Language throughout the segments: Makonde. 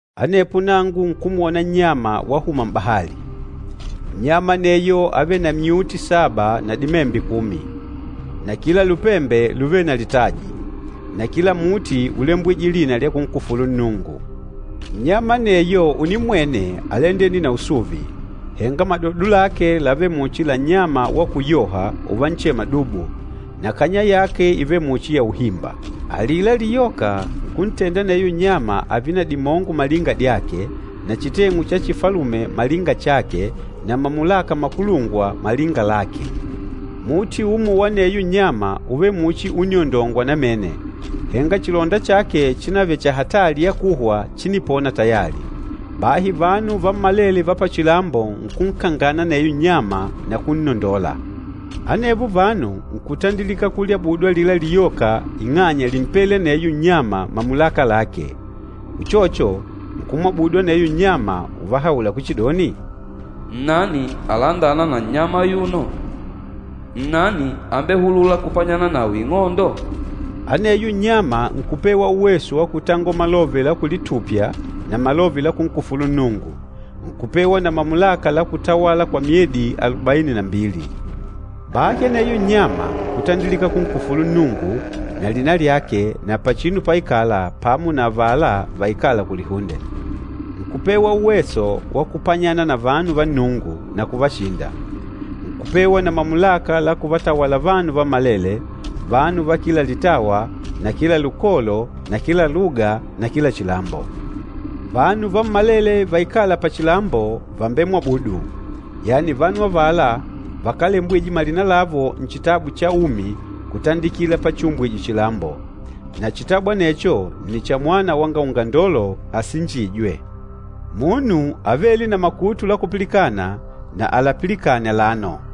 Anepo nangu nkumwona nnyama wahuma m'bahali. Nnyama aneyo ávele na myuti saba na dimembe kumi. Na kila lupembe lúvele na litaji, na kila muti úlembwije lina lya kunkufulu Nnungu. Nnyama aneyo unimmwene álandene na usuvi, henga madodo lake lávele muchi la nnyama wa kuyoha uvanchema dubu, na kanya yake ívele muchi ya uhimba. Alila liyoka nkuntenda aneyo nnyama ààve na dimongo malinga dyake na chiteng'u cha chifalume malinga chake na mamulaka makulungwa malinga lake. Muti umo wa aneyo nnyama úvele muchi úniondongwa namene, henga chilonda chake chinavele cha hatali ya kuhwa chínipona tayali. Bahi vanu vammalele va pachilambo nkunkangana aneyo nnyama na kunnondola. Anevo vanu nkutandilika kulyabudu alila liyoka ing'anya límpele aneyo nnyama mamulaka lake. Uchocho, nkumwabudu aneyo nnyama uvahaula kuchidoni, “Nnani alandâna na nnyama ayuno? Nnani ambehulûla kupanyana nawe ing'ondo?” Aneyo nnyama nkupewa uweso wa kutangola malove la kulitupya na malove la kunkufulu Nnungu. Nkupewa na mamulaka la kutawala kwa myedi alubaini na mbili. Bahi aneyo nnyama nkutandilika kunkufulu Nnungu, na lina lyake na pachinu páikàlà pamo na avala vaikâla kulihunde. Nkupewa uweso wa kupanyana na vanu va Nnungu, na kuvashinda. Nkupewa na mamulaka la kuvatawala vanu vammalele, vanu va kila litawa na kila lukolo na kila luga na kila chilambo. Vanu vammalele vaikâla pachilambo vàmbemwabudu, yani vanu avala vakálembwije malina lavo Nchitabu cha Umi kutandikila pachiumbwije chilambo. Na chitabu anecho nni cha Mwana wanga Ungandolo asinjîjwe. Munu avêle na makutu la kupilikana, na alapilikane alano.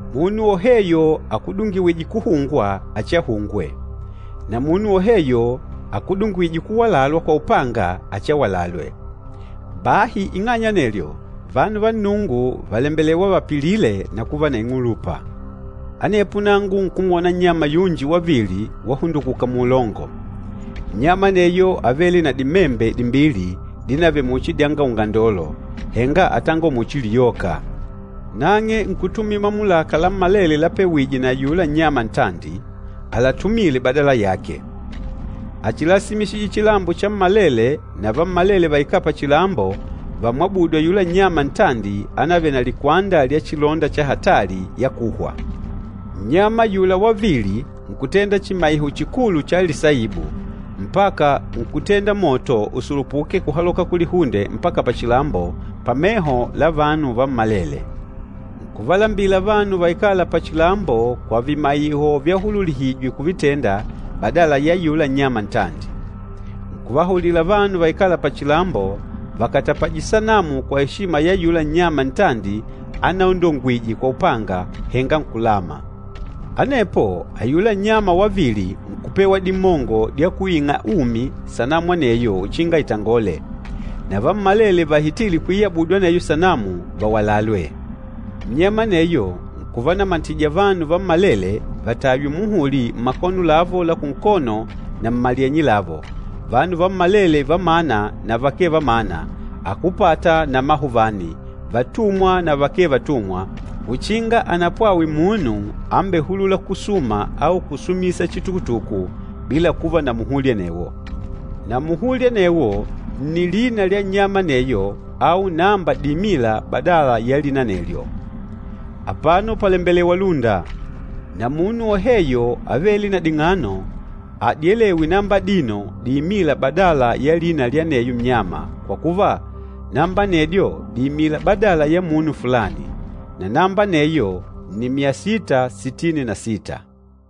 Munu woheyo akudungiwîje kuhungwa, achiahungwe. Na munu woheyo akudungiwîje kuwalalwa kwa upanga, achiawalalwe. Bahi ing'anya anelyo, vanu va Nnungu vàlembelewa vapilile na kuva na ing'ulupa. Anepo nangu nkumwona nnyama yunji wavili wahundukuka muulongo. Nnyama aneyo ávele na dimembe dimbili dinavele muchi dyanga ungandolo, henga átangola muchi liyoka. Nang'e nkutumila mamulaka lammalele lapewije na ayula nnyama ntandi, àlatumile badala yake. Áchilasimisije chilambo chammalele na vammalele vaikâla pachilambo vàmwabudu ayula nnyama ntandi ánavele na likwanda lya chilonda cha hatali ya kuhwa. Nnyama ayula wavili nkutenda chimaiho chikulu cha lisaibu, mpaka nkutenda moto usulupuke kuhaloka kulihunde mpaka pachilambo, pameho la vanu vammalele. Nkuvalambila vanu vaikâla pachilambo kwa vimaiho vyahululihijwe kuvitenda badala ya ayula nnyama ntandi. Nkuvahaulila vanu vaikâla pachilambo vakatapaje sanamu kwa eshima ya ayula nnyama ntandi anaondongwije kwa upanga, henga nkulama. Anepo ayula nnyama wavili nkupewa dimongo dya kuing'a umi sanamu aneyo uchinga itangole, na vammalele vahitîle kuiyabudu aneyo sanamu, vawalalwe. Nnyama aneyo nkuvanamatija vanu vammalele vataywe muhuli mmakono lavo la kunkono na mmalyenye lavo, vanu vammalele va mana na vakee va mana, akúpata na amahuvani, vatumwa na vakee vatumwa, uchinga anapwawe munu ambehulûla kusuma au kusumisa chitukutuku bila kuva na muhuli anewo. Na muhuli anewo nni lina lya nnyama aneyo au namba diimîla badala ya lina anelyo. Apano pàlembelewa lúnda. Na munu woheyo avêle na ding'ano adyelewe namba adino diimîla badala ya lina lya aneyo nnyama, kwa kuva, namba anedyo dìimila badala ya munu fulani. Na namba aneyo nni myasita sitini na sita.